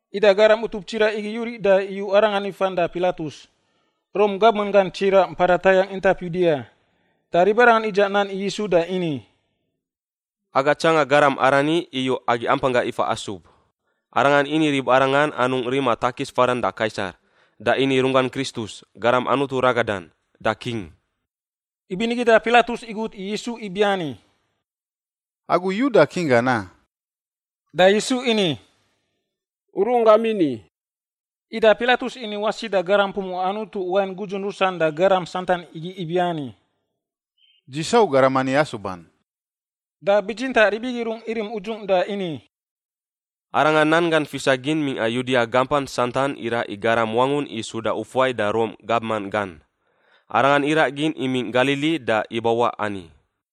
Ida garam utup tsiraꞌ igi yuriꞌ da iyu Arangan ifan da Pilatus, Rom gabman gan tsiraꞌ mpada tayangꞌ intap Yudia. Da ribarangan idzaꞌ nan i Yisu da ini, “Aga tsanga garam arani iyu agi ampanggangꞌ ifa asub. Arangan ini i ribarangan anungꞌ rima takis fadan da Kaisar, da ini runggan Kristus, Garam Anutu ragadan, da king.” Ibinigi da Pilatus igut i Yisu ibiani, “Agu Yuda king gan, a?” Da Yisu ini, “U runggam ini.” Ida Pilatus ini wasi da garam pumuꞌa Anutu wain gudzun rusan da garam santan igi ibiani, “Dzi sau garam ani asuban.” Da bitsintaꞌ rib igi rungꞌ irim udzungꞌ da ini, “Arangan nan gan fisa gin mingꞌa Yudia gampan santan iraꞌ i garam wangun i suda ufuai da Rom gabman gan. Arangan iraꞌ gin imingꞌ Galili da ibawaꞌ ani.”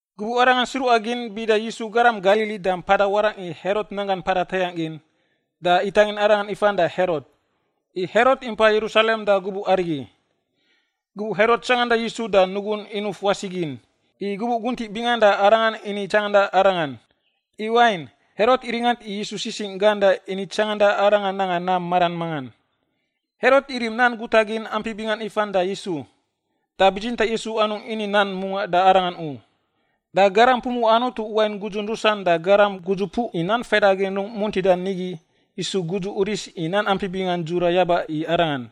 Gubuꞌ arangan sruꞌa gin bida Yisu garam Galili da mpada warangꞌ i Herot nanggan mpada tayangꞌ gin, da itangin Arangan ifan da Herot, i Herot impa Yerusalem da gubuꞌ arigi. Gubuꞌ Herot tsanganda Yisu da nugun inuf wasi gin, i gubuꞌ guntiꞌ bingan da arangan ini tsanganda Arangan. I wain, Herot iringant i Yisu sisingꞌ gan da ini tsanganda Arangan nanga nam maran mangan. Herot irim nan guta gin ampi bingan ifan da Yisu, da bitsintaꞌ Yisu anungꞌ ini nan mungaꞌ da arangan u. Da garam pumuꞌa Anutu wain gudzun rusan da garam gudzupuꞌ i nan faidagin rungꞌ muntida nigi isu gudzu uris i nan ampi bingan dzura yaba i Arangan.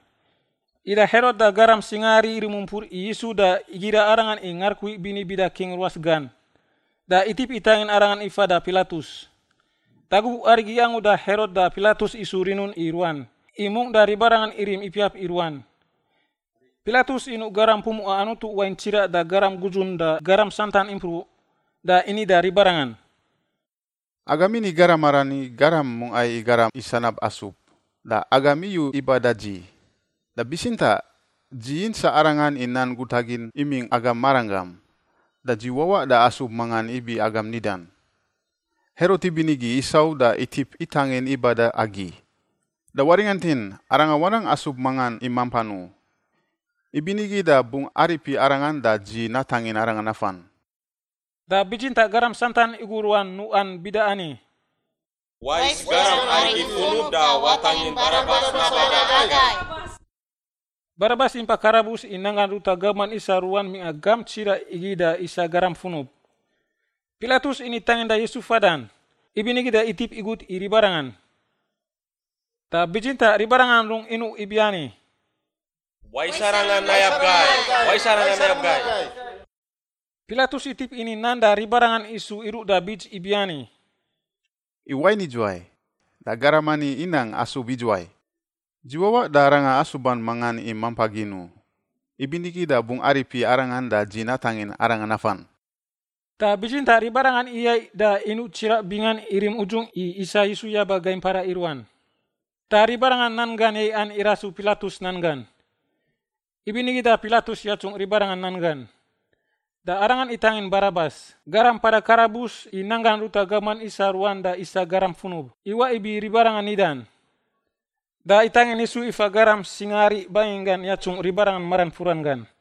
Ida Herot da garaman singaari irim umpur i Yisu da igira Arangan i ngarukui bini bida king ruas gan, da itip itangin Arangan ifa da Pilatus. Da gubuꞌ arigi angu da Herot da Pilatus isu rinun i ruan, i mungꞌ da ribarangan irim ipiap i ruan. Pilatus inuꞌ garam pumuꞌa Anutu wain tsiraꞌ da garam gudzun da garam santan impruꞌ, da ini da ribarangan, “Agam ini garam arani garam mungꞌa i garam i sanab asub, da agam iyu iba da dzi. Da bitsintaꞌ dzi yintsaꞌ arangan i nan guta gin imingꞌ agam maranggam, da dzi wawaꞌ da asub mangan ibi agam nidan. Herot ibinigi isau da itip itangin iba da agi, da waringantin, arangan wanang asub mangan i mampan u. Ibinigi da bungꞌ aripi arangan da dzi natangin arangan nafan.” Da bitsintaꞌ garam santan igu ruan nuꞌan bida ani, “Wais garam arigi funub da watangin Barabas naba da agai.” (Barabas impa karabus i nanggan ruta gabman isa ruan mingꞌa gamp tsiraꞌ igi da isa garam funub.) Pilatus ini tanginda Yisu fadan, ibinigi da itip igut i ribarangan. Da bitsintaꞌ ribarangan rungꞌ inuꞌ ibiani, “Wais arangan nayab gai! Wais arangan nayab gai!” Pilatus itip ini nan da ribarangan isu iruꞌ da bits ibiani, “I wain idzuwai? Da garam ani inang asub idzuwai? Dzi wawaꞌ da arangan asuban mangan i mampa gin u. Ibinigi da bungꞌ aripi arangan da dzi natangin arangan nafan.” Da bitsintaꞌ ribarangan iyaiꞌ da inuꞌ tsiraꞌ bingan irim udzungꞌ i isa Yisu yaba gai mpara i ruan. Da ribarangan nan gan yaiꞌan irasu Pilatus nan gan. Ibinigi da Pilatus yatsungꞌ ribarangan nan gan. Da arangan itangin Barabas, garam mpada karabus i nanggan ruta gabman isa ruan da isa garam funub, iwaꞌ ibi ribarangan nidan. Da itangin Yisu ifa garam singaari banginggan yatsungꞌ ribarangan maran furan gan.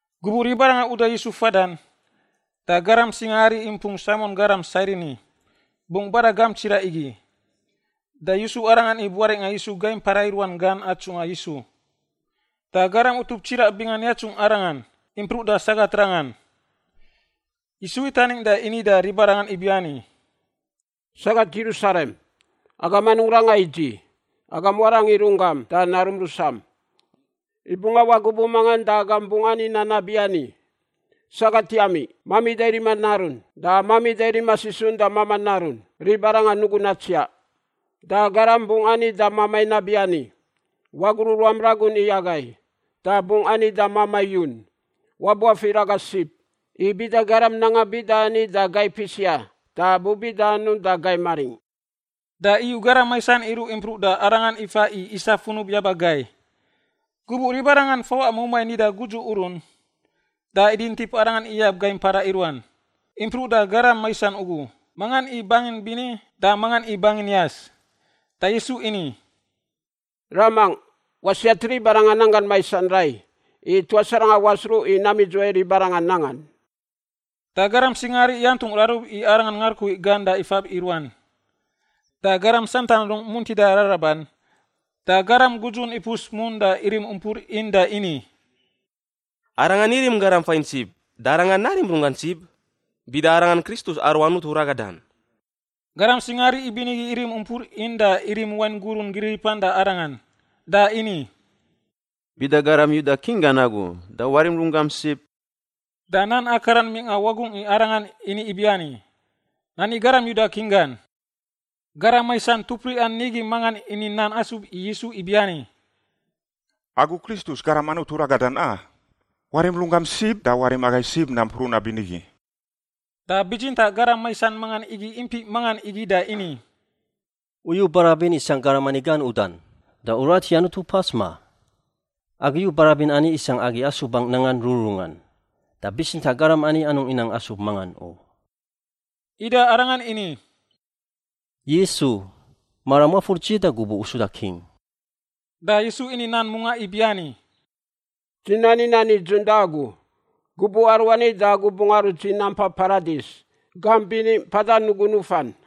Gubuꞌ ribarangan uda Yisu fadan, da garam singaari impung Saimon garam Sairini bungꞌ bada gamp tsiraꞌ igi. Da yusu arangan i buaringꞌa Yisu gai mpara i ruan gan atsungꞌa Yisu. Da garam utup tsiraꞌ bingan yatsungꞌ Arangan, impruꞌ da sagat rangan. Yisu itaning da ini da ribarangan ibiani, “Sagat Yerusalem, agam anungꞌ ranga i dzi; agam warang i runggam da narum rusam. I bungꞌ awaꞌ gubuꞌ mangan da agam bungꞌ ani nan nabiani, ‘Sagat yami, mamida rima narun, da mamida rima sisun da mamaꞌ narun, ribarangan nugun natsiaꞌ.’ Da garam bungꞌ ani da mamai nabiani, ‘Wagruꞌ ruam ragun i agai,’ da bungꞌ ani da mamai yun, ‘Wabuafir aga sib.’ I bida garam nanga bida ani da gai pisia da bu bida anungꞌ da gai maringꞌ?” Da iyu garam maisan iruꞌ impruꞌ da Arangan ifa i isa funub yaba gai. Gubuꞌ ribarangan fawaꞌa mumai nida Gudzu Urun, da idintip Arangan iyab gai mpara i ruan, impruꞌ da garam maisan ugu, mangan i bangin bini da mangan i bangin yas. Da Yisu ini, “Ramangꞌ, wasiat ribarangan nanggan maisan rai, i tuas arangan wasruꞌ i nam idzuwai ribarangan nangan.” Da garam singaari yantungꞌ rarub i Arangan ngarukui gan da ifab i ruan. Da garam santan rung muntida raraban, da garam gudzun ipus mun da irim umpur in da ini, “Arangan irim garam fain sib, da arangan narim runggan sib, bida arangan Kristus aru Anutu ragadan.” Garam singaari ibinigi irim umpur in da irim wain gurun giriripan da Arangan. Da ini, “Bida garam Yuda king gan agu, da warim runggam sib.” Da nan akaran mingꞌa wagungꞌ i Arangan ini ibiani, “Nani garam Yuda King gan.” Garam maisan tupriꞌan nigi mangan ini nan asub i Yisu ibiani, “Agu Kristus, Garam Anutu ragadan, a? Warim runggam sib da warim agai sib nampruꞌ nabinigi!” Da bitsintaꞌ garam maisan mangan igi impiꞌ mangan igi da ini, “U yu barabin isangꞌ garam ani gan udan, da u rat i Anutu pas, ma? Agi yu barabin ani isangꞌ agi asubangꞌ nangan rururungan, da bitsintaꞌ garam ani anungꞌ inang asub mangan u.” Ida arangan ini, “Yisu, maram wafur dzi da gubuꞌ u suda king.” Da Yisu ini nan mungaꞌ ibiani, “Dzi nani nan nidzun da agu, gubuꞌ aruani da agu bungꞌ arut dzi nampai Paradis, gamp bini mpada nugun nufan.”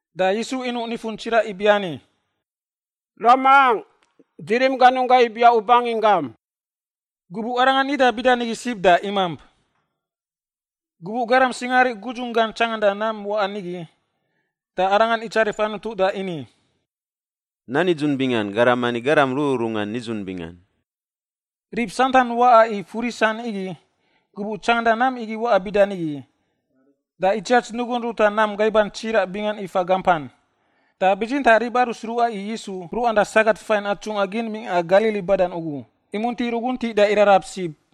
Da Yisu inuꞌ nifun tsiraꞌ ibiani, “Ramangꞌ, dzi rim ganunggangꞌ ibiaꞌ u banginggam.” Gubuꞌ Arangan nida bida nigi sib da imamp. Gubuꞌ garam singaari gudzunggan tsanganda nam waꞌan igi, da arangan itsarif Anutu da ini, “Nan nidzun bingan, garam ani garam rururungan nidzun bingan.” Rib santan waꞌa i furisan igi, gubuꞌ tsanganda nam igi waꞌa bida nigi, da itsiats nugun ruta nam gaiban tsiraꞌ bingan ifa gampan. Da bitsintaꞌ rib aru sruꞌa i Yisu, mpruꞌan da sagat fain atsungꞌa gin mingꞌa Galili badan ugu, imunti ruguntiꞌ da irarab sib.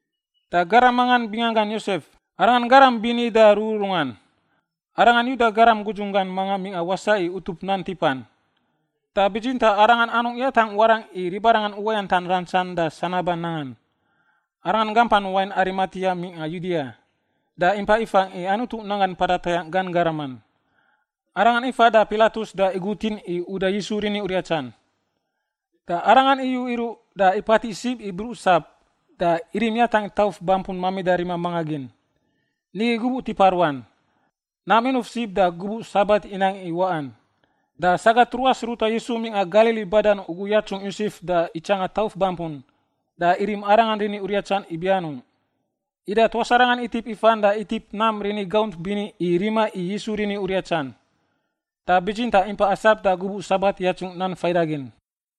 Da garam mangan binganggan Yosef, arangan garam bini da rururungan. Arangan Yuda garam gudzunggan manga mingꞌa wasaꞌ i utup nan tipan, da bitsintaꞌ arangan anungꞌ yatangꞌ warangꞌ i ribarangan uwayantan rantsan da sanaban nangan. Arangan gampan wain Arimatia mingꞌa Yudia, da impa ifangꞌ i Anutu nanggan mpada tayangꞌ gan garaman. Arangan ifa da Pilatus da igutin i uda Yisu rini uriatsan. Da arangan iyu iruꞌ da ipatiꞌ sib i bruꞌ sap da irim yatangꞌ tauf bampun mamida rima manga gin. Nigi gubuꞌ tipa ruan; nam inuf sib da gubuꞌ Sabat inang i waꞌan. Da sagat ruas ruta Yisu mingꞌa Galili badan ugu yatsungꞌ Yosef da itsanga tauf bampun da irim Arangan rini uriatsan ibi anungꞌ. Ida tuas arangan itip ifan da itip nam rini gaunt bini i rima i Yisu rini uriatsan. Da bitsintaꞌ impa asap da gubuꞌ Sabat yatsungꞌ nan faidagin.